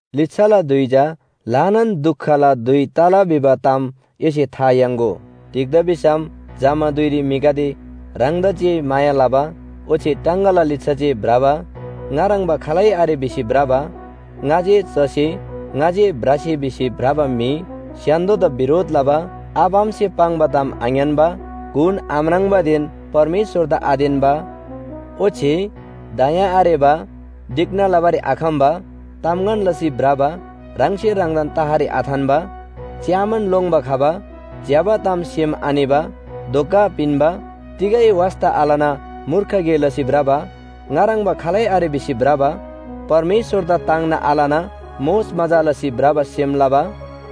लिच्‍छाला धुइ चा ल्‍हानान दुखला धुइ तला भिबा ताम एसे था याङ्‍गो। तिग्‍दा भिसम जमा धुइरी म्‍हिगदे ह्राङदा जे माया लबा, ओच्‍छे टाङगाला लिच्‍छा जे भ्रबा, ङा ह्रङ्‌बा खालै आरे भिसी भ्रबा, ङा जे चसे ङा जे भ्रसे भिसी भ्रबा म्‍हि, स्‍य्‍हान्‍दोदा बिरोध लबा, आबा आमासे पाङ्बा ताम आङ्‌यान्‍बा, गुण आम्राङ्बादेन परमेश्‍वरदा आतेन्‍बा, ओच्‍छे दया आरेबा, ढिक्‍ना लबारी आखम्‍बा, तामगन लसी भ्रबा, ह्राङसे ह्राङदान तहरी आथान्‍बा, च्‍यामान लोङ्‌बा खबा, ज्‍यबा ताम सेम आनिबा, धोका पिन्‍बा, तिगै वास्‍ता आलना मूर्ख गे लसी भ्रबा, ङा ह्रङ्‌बा खालै आरे भिसी भ्रबा, परमेश्‍वरदा ताङ्ना आलना मोजमजा लसी भ्रबा सेम लबा,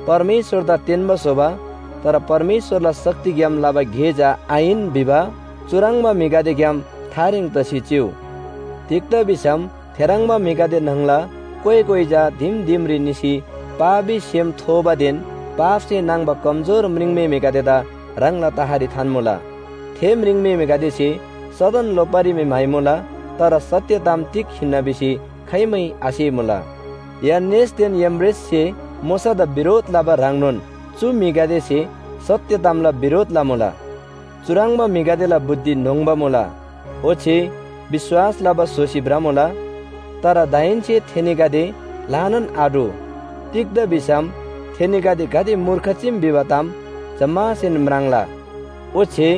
परमेश्‍वरदा तेन्‍बा स्‍होबा, तर परमेश्‍वरला शक्तिग्‍याम लबा गे चा आहिन भिबा चुह्रङ्बा म्‍हिगदेग्‍याम थारेङ तसी चिउ। तिग्‍दा भिसम थेह्रङ्बा म्‍हिगदे न्‍हङला कोइ कोइ चा दिम दिमरी निसी पापी सेम थोबादेन पापसे नाङ्‌बा कमजोर म्रिङम्‍हेमेगदेदा ह्राङला तहरी थान्‍मुला। थे म्रिङम्‍हेमेगदेसे सदन लोप्‍बारी मी म्‍हाइमुला, तर सत्‍य ताम तिग हिन्‍ना भिसी खाइमै आसेमुला। यान्‍नेसदेन याम्‍ब्रेससे मोशादा बिरोध लबा ह्रङ्नोन चु म्‍हिगदेसे सत्‍य तामला बिरोध लमुला। चुह्रङ्बा म्‍हिगदेला बुद्धि न्‍होङ्बा मुला, ओच्‍छे विश्‍वास लबा स्‍होसी भ्रमुला। तर दाहेन्‍से थेनीगदे ल्‍हानान आटु, तिग्‍दा भिसम थेनीगदे गाते मूर्ख चीम भिबा ताम जम्‍मासेन म्राङ्ला। ओच्‍छे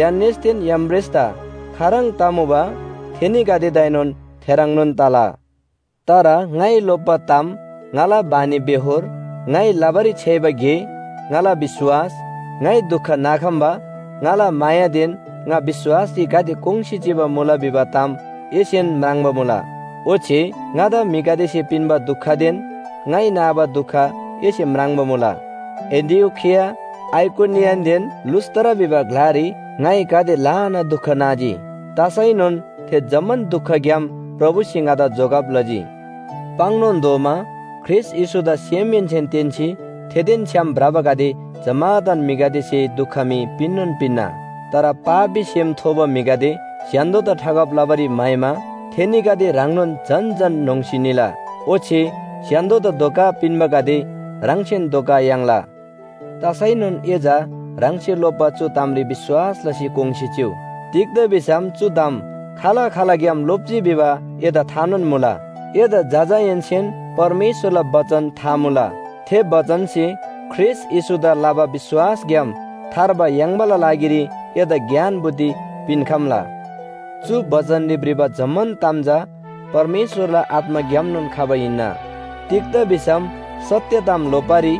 यान्‍नेसदेन याम्‍ब्रेसदा खाह्रङ् तमुबा थेनीगदेदाएनोन थेह्रङ्नोन तला। तर ङाइ लोप्‍बा ताम, ङाला बानीबेहोर, ङाइ लबारी छ्‌याइबा गे, ङाला विश्‍वास, ङाइ दुख नाखम्‍बा, ङाला मायादेन ङा विश्‍वासरी गाते कोङ्‌सी चिबा मुला भिबा ताम एसेन म्राङ्बा मुला। ओच्‍छे ङादा म्‍हिगदेसे पिन्‍बा दुखदेन ङाइ नाबा दुख एसे म्राङ्बा मुला। एन्‍टिओखिया, आइकोनियनदेन लुस्‍त्रा भिबा ग्‍लारी ङाइ गाते ल्‍हाना दुख नाजी। तसैनोन थे जम्‍मान दुखग्‍याम प्रभुसे ङादा जोगब लजी। पाङ्‌नोन तोःमा ख्रीष्‍ट येशूदा सेमहेन्‍सेन तेन्‍सी थेदेन छ्‌याम भ्रबागदे जम्‍मादान म्‍हिगदेसे दुख मी पिन्‍नोन पिन्‍ना। तर पापी सेम थोबा म्‍हिगदे स्‍य्‍हान्‍दोदा ठगब लबारी म्‍हाइमा थेनीगदे ह्राङनोन झन झन न्‍होङ्‌सी निला। ओच्‍छे स्‍य्‍हान्‍दोदा धोका पिन्‍बागदे ह्राङसेन धोका याङ्ला। तसैनोन ए चा ह्राङसे लोप्‍बा चु तामरी विश्‍वास लसी कोङ्‌सी चिउ। तिग्‍दा भिसम चु ताम खाल खालग्‍याम लोप्‍जी भिबा एदा थानोन मुला। एदा जजाहेन्‍सेन परमेश्‍वरला बचन था मुला। थे बचनसे ख्रीष्‍ट येशूदा लबा विश्‍वासग्‍याम थार्बा याङ्बाला लागिरी एदा ज्ञान बुद्धि पिन्‍खम्‍ला। चु बचनरी भ्रिबा जम्‍मान ताम चा परमेश्‍वरला आत्‍माग्‍यामनोन खबा हिन्‍ना। तिग्‍दा भिसम सत्‍य ताम लोप्‍बारी,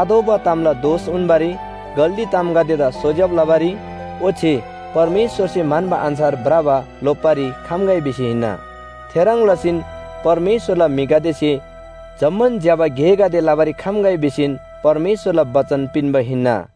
आतोःबा तामला दोष उन्‍बारी, गल्‍ती तामगदेदा सोज्‍यब लबारी ओच्‍छे परमेश्‍वरसे म्‍हन्‍बा अन्‍छार भ्रबा लोप्‍बारी खम्‍गै भिसी हिन्‍ना। थेह्रङ् लसीन परमेश्‍वरला म्‍हिगदेसे जम्‍मान ज्‍यबा गेगदे लबारी खम्‍गै भिसीन परमेश्‍वरला बचन पिन्‍बा हिन्‍ना।